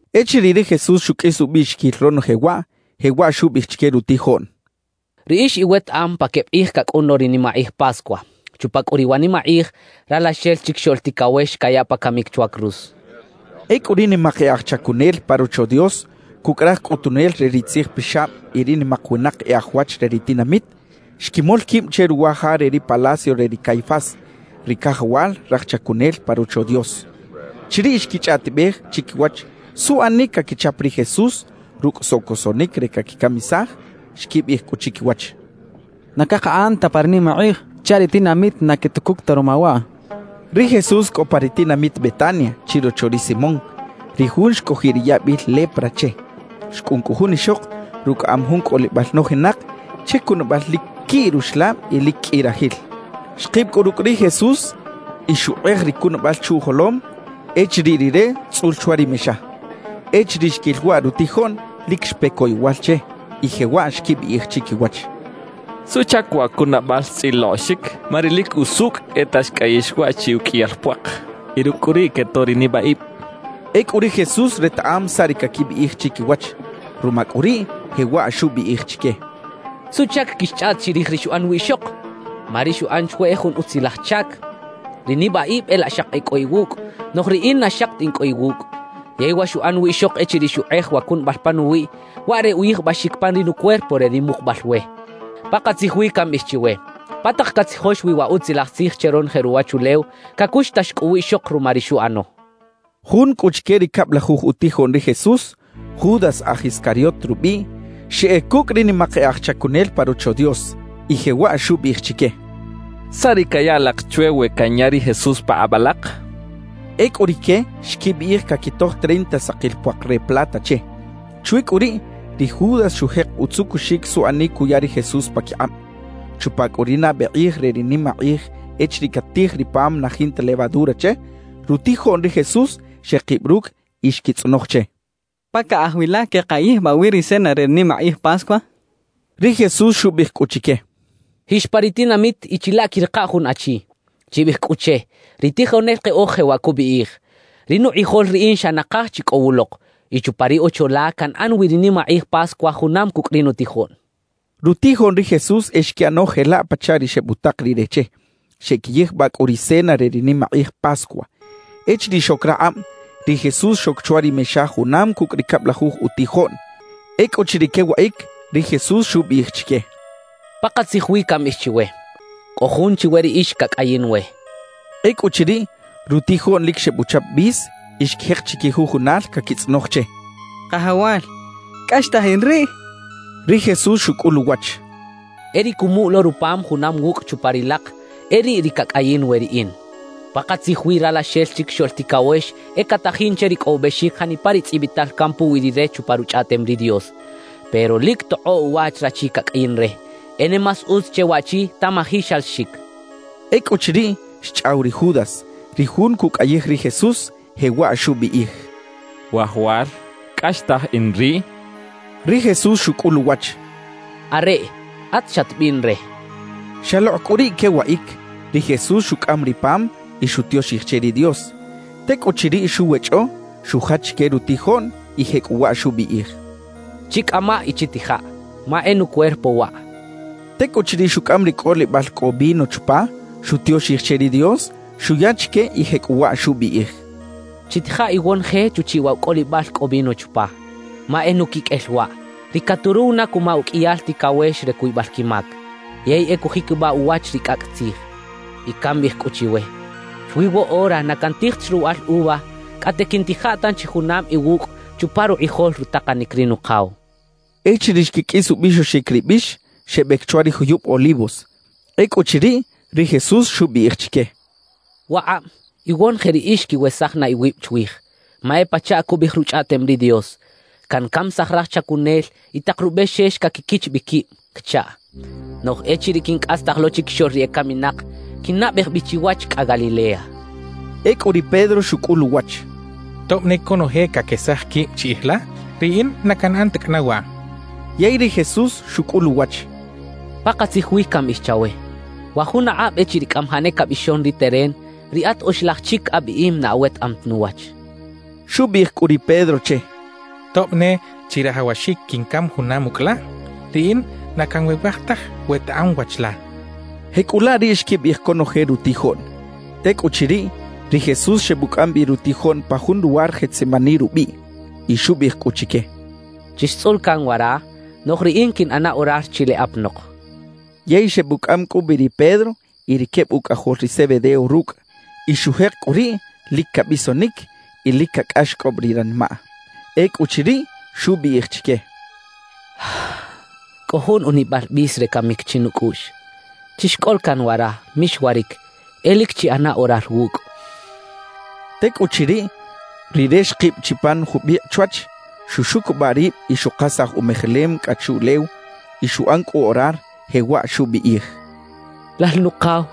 Echiriꞌ ri Jesús xukꞌis ubꞌiꞌxikil ronoje waꞌ, jewaꞌ xubꞌiꞌij chike rutijoꞌn: «Riꞌix iwetaꞌam pa kebꞌ qꞌij kakꞌun lo ri nimaqꞌij Pascua; chupa kꞌu riꞌ wa nimaqꞌij, Ralaxel Chikixoꞌl Tikawex kayaꞌ pa kamik chwa cruz» xchaꞌ. Ekꞌu ri nimaq e aj chakunel pa Rocho Dios kukꞌ raj kꞌutunel re ri tzijpixabꞌ y ri nimaq winaq e aj wach re ri tinamit, xkimol kibꞌ che ruwa ja re ri palacio re ri Caifás, ri kajawal raj chakunel pa Rocho Dios. Chiriꞌ xkichꞌaꞌtibꞌej chikiwach suꞌanik kakichap ri Jesús rukꞌ sokosoꞌnik re kakikamisaj. Xkibꞌiꞌij kꞌu chikiwach: «Na kaqaꞌan ta pa ri nimaqꞌij chaꞌ ri tinamit na ketukuk ta ruma waꞌ» xechaꞌ. Ri Jesús kꞌo pa ri tinamit Betania chirocho ri Simón, ri jun xkꞌojiꞌ ri yabꞌil lepra che. Xkꞌun kꞌu jun ixoq rukꞌaꞌam jun kꞌolibꞌal nojinaq che kunabꞌal lik kiꞌ ruxlabꞌ y lik kꞌi rajil. Xqibꞌ kꞌu rukꞌ ri Jesús y xuqꞌej ri kunabꞌal chuꞌjolom echiriꞌ Rire tzꞌul chwa ri mexa. Echiriꞌ xkil waꞌ rutijoꞌn, lik xpe koyowal che y jewaꞌ xkibꞌiꞌij chikiwach: —¿Suꞌchak wa kunabꞌal xtzꞌiloꞌxik? Ma ri lik usukꞌ e ta xkꞌayix waꞌ chi ukꞌiyal puaq, y rukꞌ kꞌu riꞌ ketoꞌ ri nibꞌaꞌibꞌ —xechaꞌ. Ekꞌu ri Jesús retaꞌam saꞌ ri kakibꞌiꞌij chikiwach; ruma kꞌu riꞌ, jewaꞌ xubꞌiꞌij chike: —¿Suꞌchak kixchꞌaꞌt chirij ri xuꞌan wiꞌxoq? Ma ri xuꞌan chwe e jun utzilaj chak. Ri nibꞌaꞌibꞌ e laꞌ xaqi e kꞌo iwukꞌ; noꞌj riꞌin na xaqi ta in kꞌo iwukꞌ. Yey wa xuꞌan wiꞌxoq echiriꞌ xuqꞌej wa kunabꞌal panuwiꞌ, waꞌ re uyijbꞌaxik pan ri nucuerpo re ri muqubꞌal we. Paqatzij wi kambꞌiꞌij chiwe: Pa taq katzijox wi wa Utzilaj Tzij che ronoje ruwachulew, kakuxtax kꞌu wiꞌxoq ruma ri xuꞌano —xchaꞌ. Jun kꞌu chike ri kabꞌlajuj utijoꞌn ri Jesús, Judas aj Iscariot rubꞌiꞌ, xeꞌek kukꞌ ri nimaq e aj chakunel pa Rocho Dios y jewaꞌ xubꞌiꞌij chike: —¿Saꞌ ri kaya alaq chwe we kanya ri Jesús paqꞌabꞌ alaq? —xchaꞌ. Ekꞌu rike xkibꞌiꞌij kakitoj treinta saqil puaq re plata che. Chwi kꞌu riꞌ, ri Judas xujeq utzukuxik suꞌanik kuya ri Jesús pakiqꞌabꞌ. Chupa kꞌu ri nabꞌe qꞌij re ri nimaqꞌij echiriꞌ katij ri pam na jinta levadura che, rutijoꞌn ri Jesús xeqibꞌ rukꞌ y xkitzꞌonoj che: —¿Pa kaꞌaj wi la keꞌqayijbꞌaꞌ wi ri cena re ri nimaqꞌij Pascua? —xechaꞌ. Ri Jesús xubꞌiꞌij kꞌu chike: —Jix pa ri tinamit y chilaꞌ kiꞌriqa jun achi; chibꞌiꞌij kꞌu che: “Ri tijonel qeꞌoj jewaꞌ kubꞌiꞌij: Ri nuqꞌijol riꞌin xa naqaj chi kꞌo wuloq, y chupa ri ocho la kanꞌan wi ri nimaqꞌij Pascua junam kukꞌ ri nutijoꞌn” —xchaꞌ. Rutijoꞌn ri Jesús e xkiꞌano jelaꞌ pachaꞌ ri xebꞌutaq Rire che, xeꞌkiyijbꞌaꞌ kꞌu ri cena re ri nimaqꞌij Pascua. Echiriꞌ xok raqꞌabꞌ, ri Jesús xok chwa ri mexa junam kukꞌ ri kabꞌlajuj utijoꞌn. Ekꞌuchiriꞌ kewaꞌik, ri Jesús xubꞌiꞌij chike: —Paqatzij wi kambꞌiꞌij chiwe: Kꞌo jun chiwe riꞌix kakꞌayin we —xchaꞌ. Ekꞌuchiriꞌ, rutijoꞌn lik xebꞌuchap bꞌis y xkijeq chikijujunal kakitzꞌonoj che: —Qajawal, ¿kꞌaxtaj in riꞌ? —kechaꞌ. Ri Jesús xukꞌul uwach: —E ri kumuꞌ lo rupam junam wukꞌ chupa ri laq, e riꞌ ri kakꞌayin we riꞌin. Paqatzij wi Ralaxel Chikixoꞌl Tikawex e katajin che rikꞌowibꞌexik janipa ri tzꞌibꞌital kan puwi Rire chupa Ruchꞌaꞌtem ri Dios. Pero ¡lik toqꞌoꞌ uwach rachi kakꞌayin re! E ne más utz che waꞌchi tamaji xalaxik —xchaꞌ. Ekꞌuchiriꞌ, xchꞌaw ri Judas, ri jun kukꞌayij ri Jesús, jewaꞌ xubꞌiꞌij: —Wajawal, ¿kꞌaxtaj in riꞌ? —xchaꞌ. Ri Jesús xukꞌul uwach: —Areꞌ; at xatbꞌiꞌn re —xchaꞌ. Xaloqꞌ kꞌu riꞌ kewaꞌik, ri Jesús xukꞌam ri pam y xutioxij che ri Dios. Tekꞌuchiriꞌ xuwechꞌo, xujach chike rutijoꞌn y jekꞌuwaꞌ xubꞌiꞌij: —Chikꞌamaꞌ y chitijaꞌ, ma e nucuerpo waꞌ —xchaꞌ. Tekꞌuchiriꞌ xukꞌam ri kꞌolibꞌal kꞌo vino chupa, xutioxij che ri Dios, xuya chike y jekꞌuwaꞌ xubꞌiꞌij: —Chitija iwonoje chuchiꞌ waꞌ wa kꞌolibꞌal kꞌo vino chupa, ma e nukikꞌel waꞌ, ri katuruw na kuma ukꞌiyal tikawex re kuybꞌal kimak, yey e kujikibꞌaꞌ uwach ri kꞌakꞌ tzij. Y kambꞌiꞌij kꞌu chiwe: Chwi woꞌora na kantij ta chi ruwaꞌal uva kꞌate kiꞌntija tanchi junam iwukꞌ chupa ruqꞌijol rutaqanik ri Nuqaw —xchaꞌ. Echiriꞌ xkikꞌis ubꞌixoxik ri bꞌix, xebꞌek chwa ri juyubꞌ Olivos. Ekꞌuchiriꞌ, ri Jesús xubꞌiꞌij chike: —Waqꞌabꞌ iwonoje riꞌix kiwesaj na iwibꞌ chwij, ma e pachaꞌ kubꞌiꞌij Ruchꞌaꞌtem ri Dios: Kankamisaj raj chajinel y taq rubꞌexex kakikich bꞌi kibꞌ kachaꞌ. Noꞌj echiriꞌ kinkꞌastaj lo chikixoꞌl ri ekaminaq, kinnabꞌej bꞌi chiwach kꞌa Galilea —xchaꞌ. Ekꞌu ri Pedro xukꞌul uwach: —Tobꞌ ne konoje kakesaj kibꞌ chiꞌij la, riꞌin na kanꞌan ta kꞌana waꞌ —xchaꞌ. Yey ri Jesús xukꞌul uwach: —Paqatzij wi kambꞌiꞌij chawe: Wa jun aqꞌabꞌ echiriꞌ kꞌamajaꞌ ne kabꞌixon ri teren, riꞌat oxlaj chik abꞌiꞌim na awetaꞌam ta nuwach —xchaꞌ. Xubꞌiꞌij kꞌu ri Pedro che: —Tobꞌ ne chirajawaxik kinkam junam ukꞌ la, riꞌin na kanwewaj taj wetaꞌam wach la —xchaꞌ. Jekꞌulaꞌ riꞌ xkibꞌiꞌij konoje rutijoꞌn. Tekꞌuchiriꞌ, ri Jesús xebꞌukꞌam bꞌi rutijoꞌn pa jun luwar Getsemaní rubꞌiꞌ, y xubꞌiꞌij kꞌu chike: —Chixtzꞌula kan wara, noꞌj riꞌin kiꞌnꞌana orar chileꞌ apanoq —xchaꞌ. Yey xebꞌukꞌam kꞌu bꞌi ri Pedro y ri kebꞌ ukꞌajol ri Zebedeo rukꞌ. Y xujeq kꞌu riꞌ lik kabꞌisonik y lik kakꞌaxkꞌobꞌ ri ranimaꞌ. Ekꞌuchiriꞌ, xubꞌiꞌij chike: —Kꞌo jun unimal bꞌis re kamik chinukꞌuꞌx. Chixkꞌola kan wara; mixwarik, e lik chiꞌana orar wukꞌ —xchaꞌ. Tekꞌuchiriꞌ, Rire xqibꞌ chi pan jubꞌiqꞌ chwach, xuxukubꞌaꞌ ribꞌ y xuqasaj umejelem kꞌa chuꞌlew, y xuꞌan kꞌu orar, jewaꞌ xubꞌiꞌij: «Lal Nuqaw,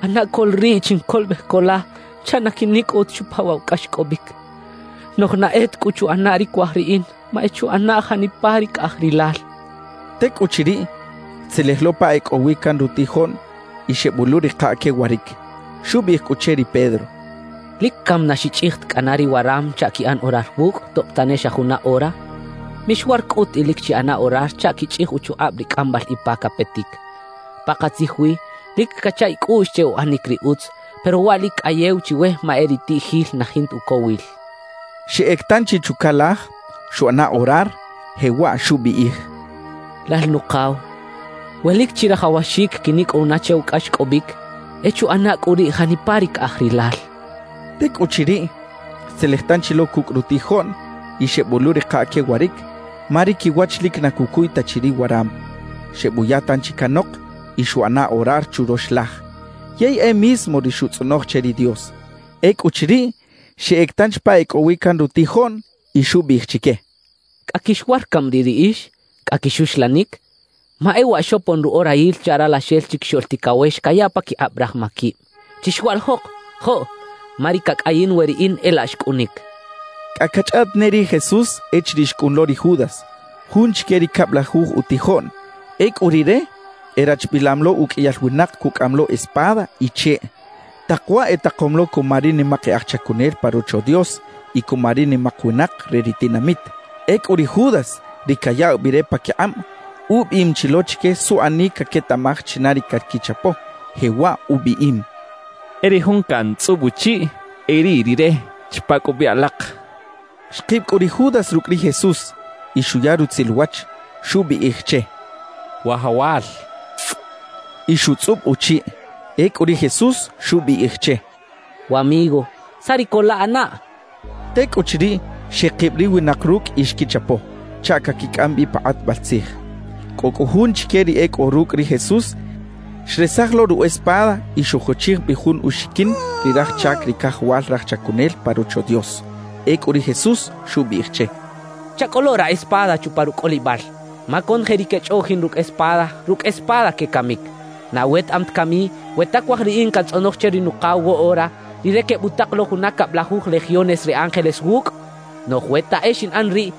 ꞌana ko la riꞌ chinkolobꞌej ko la chaꞌ na kinikꞌow ta chupa waꞌ wa kꞌaxkꞌobꞌik. Noꞌj na e ta kꞌu chuꞌana ri kuaj riꞌin, ma e chuꞌana janipa ri kaꞌaj Rilal» xchaꞌ. Tekꞌuchiriꞌ, xtzelej lo pa e kꞌo wi kan rutijoꞌn y xebꞌoꞌluꞌriqaꞌ kewarik. Xubꞌiꞌij kꞌu che ri Pedro: —¿Lik kami na xichꞌij ta kꞌana ri waram chaꞌ kiꞌan orar wukꞌ, tobꞌ tane xa juna ora? Mixwar kꞌut y lik chiꞌana orar chaꞌ kichꞌij uchuqꞌabꞌ ri kꞌambꞌal ipa kapetik. Paqatzij wi, lik kacha ikꞌuꞌx che uꞌanik ri utz, pero waꞌ lik kꞌayew chiwe ma e ri itiꞌjil na jinta ukowil —xchaꞌ. Xeꞌek tanchi chukalaj, xuꞌana orar, jewaꞌ xubꞌiꞌij: «Lal Nuqaw, we lik chirajawaxik kinikꞌow na che wa kꞌaxkꞌobꞌik, e chuꞌana kꞌu riꞌ janipa ri kaꞌaj Rilal» xchaꞌ. Tekꞌuchiriꞌ, xtzelej tanchi lo kukꞌ rutijoꞌn y xebꞌoꞌluꞌriqaꞌ kewarik, ma ri kiwach lik na kukuy ta chi ri waram. Xebꞌuya tanchi kanoq y xuꞌana orar churox laj, yey e mismo ri xutzꞌonoj che ri Dios. Ekꞌuchiriꞌ, xeꞌek tanchi pa e kꞌo wi kan rutijoꞌn y xubꞌiꞌij chike: —¿Kꞌa kixwar kami riꞌ riꞌix? ¿Kꞌa kixuxlanik? Ma e waꞌ xopon ruꞌorayil chaꞌ Ralaxel Chikixoꞌl Tikawex kayaꞌ pakiqꞌabꞌ raj makibꞌ. ¡Chixwaꞌlijoq! ¡Joꞌ! Ma ri kakꞌayin we riꞌin e laꞌ xkꞌunik —xchaꞌ. Kꞌa kachꞌaꞌt ne ri Jesús echiriꞌ xkꞌun lo ri Judas, jun chike ri kabꞌlajuj utijoꞌn. Ekꞌu rire erachbꞌilam lo ukꞌiyal winaq kukꞌaꞌam lo espada y cheꞌ. Taq waꞌ etaqom lo kuma ri nimaq e aj chakunel pa Rocho Dios y kuma ri nimaq winaq re ri tinamit. Ekꞌu ri Judas, ri kayaꞌw bꞌi re pakiqꞌabꞌ, ubꞌiꞌim chi lo chike suꞌanik kaketaꞌmaj china ri kakichapo, jewaꞌ ubꞌiꞌim: «E ri jun kantzꞌubꞌ uchiꞌ, e riꞌ rire. Chapa kꞌu bꞌi alaq.» Xqibꞌ kꞌu ri Judas rukꞌ ri Jesús y xuya rutzil uwach, xubꞌiꞌij che: —Wajawal —xchaꞌ. Y xutzꞌubꞌ uchiꞌ. Ekꞌu ri Jesús xubꞌiꞌij che: —Wamigo, ¿saꞌ ri kolaꞌanaꞌ? —xchaꞌ. Tekꞌuchiriꞌ, xeqibꞌ ri winaq rukꞌ y xkichapo chaꞌ kakikꞌam bꞌi pa qꞌatbꞌal tzij. Kꞌo kꞌu jun chike ri e kꞌo rukꞌ ri Jesús, xresaj lo ru espada y xujochij bꞌi jun uxikin ri raj chak ri kajawal raj chakunel pa Rocho Dios. Ekꞌu ri Jesús xubꞌiꞌij che: —Chakꞌolo ra espada chupa rukꞌolibꞌal; ma konoje ri kechꞌoꞌjin rukꞌ espada, rukꞌ espada kekamik. ¿Na awetaꞌam ta kami, we ta kuaj riꞌin kantzꞌonoj che ri Nuqaw woꞌora, Rire kebꞌutaq lo juna kabꞌlajuj legiones re ángeles wukꞌ? Noꞌj we ta e xinꞌan riꞌ,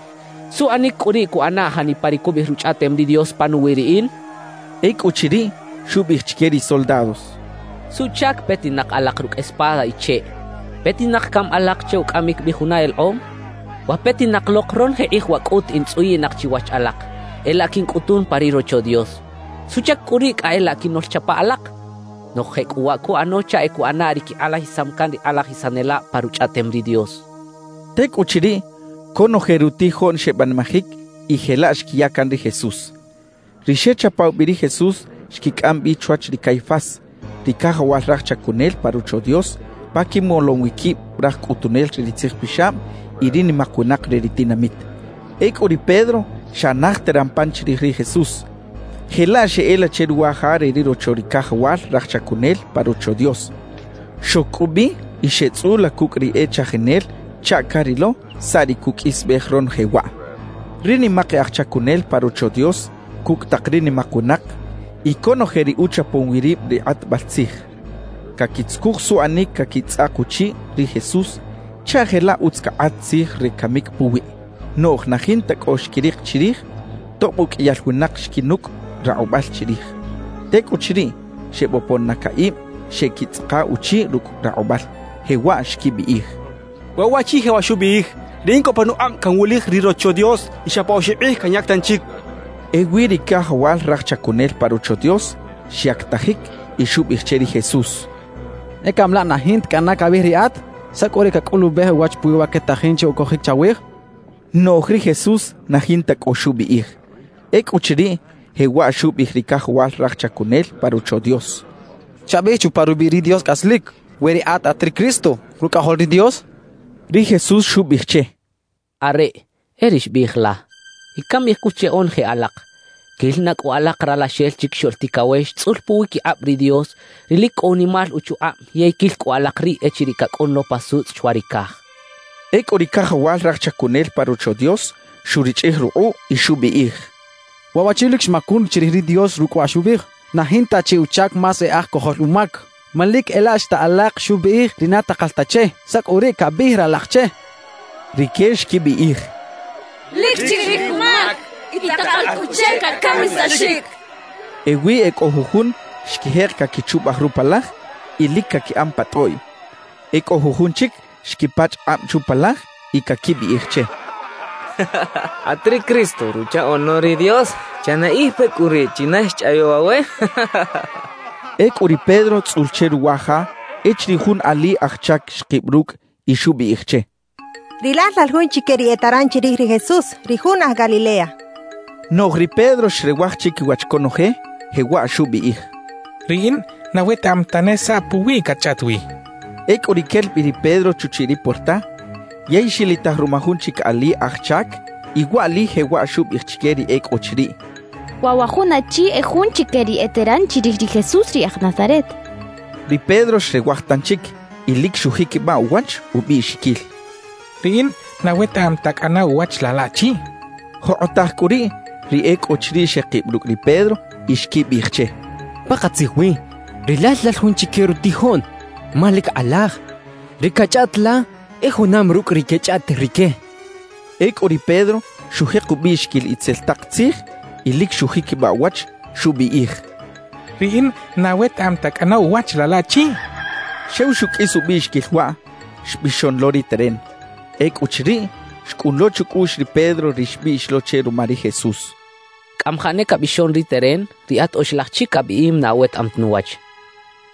¿suꞌanik kꞌu riꞌ kuꞌana janipa ri kubꞌiꞌij Ruchꞌaꞌtem ri Dios panuwi riꞌin? —xchaꞌ. Ekꞌuchiriꞌ, xubꞌiꞌij chike ri soldados: —¿Suꞌchak petinaq alaq rukꞌ espada y cheꞌ? ¿Petinaq kami alaq che ukꞌamik bꞌi juna eleqꞌom? Wa petinaq loq ronoje qꞌij waꞌ kꞌut in tzꞌuyiꞌnaq chiwach alaq, e laꞌ kinkꞌutun pa ri Rocho Dios. ¿Suꞌchak kꞌu riꞌ kꞌa e laꞌ kinoꞌlchapa alaq? Noꞌj jekꞌuwaꞌ kuꞌano chaꞌ e kuꞌana ri kiqꞌalajisam kan ri qꞌalajisanelabꞌ pa Ruchꞌaꞌtem ri Dios —xchaꞌ. Tekꞌuchiriꞌ, konoje rutijoꞌn xebꞌanimajik y jelaꞌ xkiya kan ri Jesús. Ri xechapaw bꞌi ri Jesús xkikꞌam bꞌi chwach ri Caifás, ri kajawal raj chakunel pa Rocho Dios, pa kimolom wi kibꞌ raj kꞌutunel re ri tzijpixabꞌ y ri nimaq winaq re ri tinamit. Ekꞌu ri Pedro xa naj teran pan chirij ri Jesús, jelaꞌ xeꞌela che ruwa ja re ri rocho ri kajawal raj chakunel pa Rocho Dios. Xok kꞌu bꞌi y xeꞌtzꞌula kukꞌ ri e chajinel chaꞌ karilo saꞌ ri kukꞌisbꞌej ronoje waꞌ. Ri nimaq e aj chakunel pa Rocho Dios kukꞌ taq ri nimaq winaq y konoje ri uchapom wi ribꞌ ri qꞌatbꞌal tzij, kakitzukuj suꞌanik kakitzꞌaq uchiꞌ ri Jesús chaꞌ jelaꞌ utz kaqꞌat tzij re kamik puwiꞌ. Noꞌj na jinta kꞌo xkiriq chirij, tobꞌ ukꞌiyal winaq xkinukꞌ raqꞌubꞌal chirij. Tekꞌuchiriꞌ, xebꞌopon na kaꞌibꞌ xeꞌkitzꞌaqa uchiꞌ rukꞌ raqꞌubꞌal, jewaꞌ xkibꞌiꞌij: —Waꞌ waꞌchi jewaꞌ xubꞌiꞌij: “Riꞌin kꞌo panuqꞌabꞌ kanwulij ri Rocho Dios y xa pa oxibꞌ qꞌij kanyak tanchik” —xechaꞌ. Ewi ri kajawal raj chakunel pa Rocho Dios xyaktajik y xubꞌiꞌij che ri Jesús: —¿E kami laꞌ na jinta kꞌana kabꞌiꞌij riꞌat? ¿Saꞌ kꞌu ri kakꞌulubꞌej uwach puwi wa ketajin che ukojik chawij? —xchaꞌ. Noꞌj ri Jesús na jinta kꞌo xubꞌiꞌij. Ekꞌuchiriꞌ, jewaꞌ xubꞌiꞌij ri kajawal raj chakunel pa Rocho Dios: —Chabꞌiꞌij chupa rubꞌiꞌ ri Dios kꞌaslik, we riꞌat at ri Cristo, Rukꞌajol ri Dios —xchaꞌ. Ri Jesús xubꞌiꞌij che: —Areꞌ, e ri xbꞌiꞌij la. Y kambꞌiꞌij kꞌu che onoje alaq: Kil na kꞌu alaq Ralaxel Chikixoꞌl Tikawex tzꞌul puwikiqꞌabꞌ ri Dios, ri lik kꞌo unimal uchuqꞌabꞌ yey kil kꞌu alaq riꞌ echiriꞌ kakꞌun lo pa sutzꞌ chwa ri kaj —xchaꞌ. Ekꞌu ri kajawal raj chakunel pa Rocho Dios xurichꞌij ruqꞌuꞌ y xubꞌiꞌij: —Waꞌ waꞌchi lik xmakun chirij ri Dios rukꞌ wa xubꞌiꞌij. ¡Na jinta chi uchak más e aj kojol umak! Ma lik e laꞌ xta alaq xubꞌiꞌij ri na taqal ta che. ¿Saꞌ kꞌu riꞌ kabꞌiꞌij ralaq che? —xchaꞌ. Rike xkibꞌiꞌij: —Lik chirij umak y taqal kꞌu che kakamisaxik —xechaꞌ. Ewi e kꞌo jujun xkijeq kakichubꞌaj rupalaj y lik kakiꞌan pa tꞌoꞌy. E kꞌo jujun chik xkipachꞌ qꞌabꞌ chupalaj y kakibꞌiꞌij che: —At ri Cristo, Ruchaꞌoꞌn lo ri Dios, ¡chanaꞌij pe kꞌu riꞌ china xchꞌayaw awe! —kecha che. Ekꞌu ri Pedro tzꞌul che ruwa ja echiriꞌ jun ali aj chak xqibꞌ rukꞌ y xubꞌiꞌij che: —Rilal lal jun chike ri eteran chirij ri Jesús, ri jun aj Galilea —xchaꞌ. Noꞌj ri Pedro xrewaj chikiwach konoje, jewaꞌ xubꞌiꞌij: —Riꞌin na wetaꞌam tane saꞌ puwiꞌ katchꞌaꞌt wi —xchaꞌ. Ekꞌu riꞌ kel bꞌi ri Pedro chuchiꞌ ri puerta yey xilitaj ruma jun chik ali aj chak, y waꞌli jewaꞌ xubꞌiꞌij chike ri e kꞌo chiriꞌ: —Waꞌ wa jun achi e jun chike ri eteran chirij ri Jesús ri aj Nazaret —xchaꞌ. Ri Pedro xrewaj tanchik y lik xujikibꞌaꞌ uwach ubꞌiꞌxikil: —Riꞌin na wetaꞌam ta kꞌana uwach laꞌ laꞌchi —xchaꞌ. Joqꞌotaj kꞌu riꞌ, ri e kꞌo chiriꞌ xeqibꞌ rukꞌ ri Pedro y xkibꞌiꞌij che: —Paqatzij wi rilal lal jun chike rutijoꞌn; ma lik qꞌalaj, ri kachꞌaꞌt la e junam rukꞌ ri kechꞌaꞌt rike —xechaꞌ. Ekꞌu ri Pedro xujeq ubꞌiꞌxikil itzel taq tzij y lik xujikibꞌaꞌ uwach, xubꞌiꞌij: —Riꞌin na wetaꞌam ta kꞌana uwach laꞌ laꞌchi —xchaꞌ. Xew xukꞌis ubꞌiꞌxikil waꞌ, xbꞌixon lo ri teren. Ekꞌuchiriꞌ, xkꞌun lo chukꞌuꞌx ri Pedro ri xbꞌiꞌx lo che ruma ri Jesús: «Kꞌamajaꞌ ne kabꞌixon ri teren, riꞌat oxlaj chik abꞌiꞌim na awetaꞌam ta nuwach.»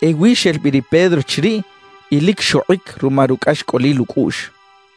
Ewi xel bꞌi ri Pedro chiriꞌ y lik xoqꞌik ruma rukꞌaxkꞌolil ukꞌuꞌx.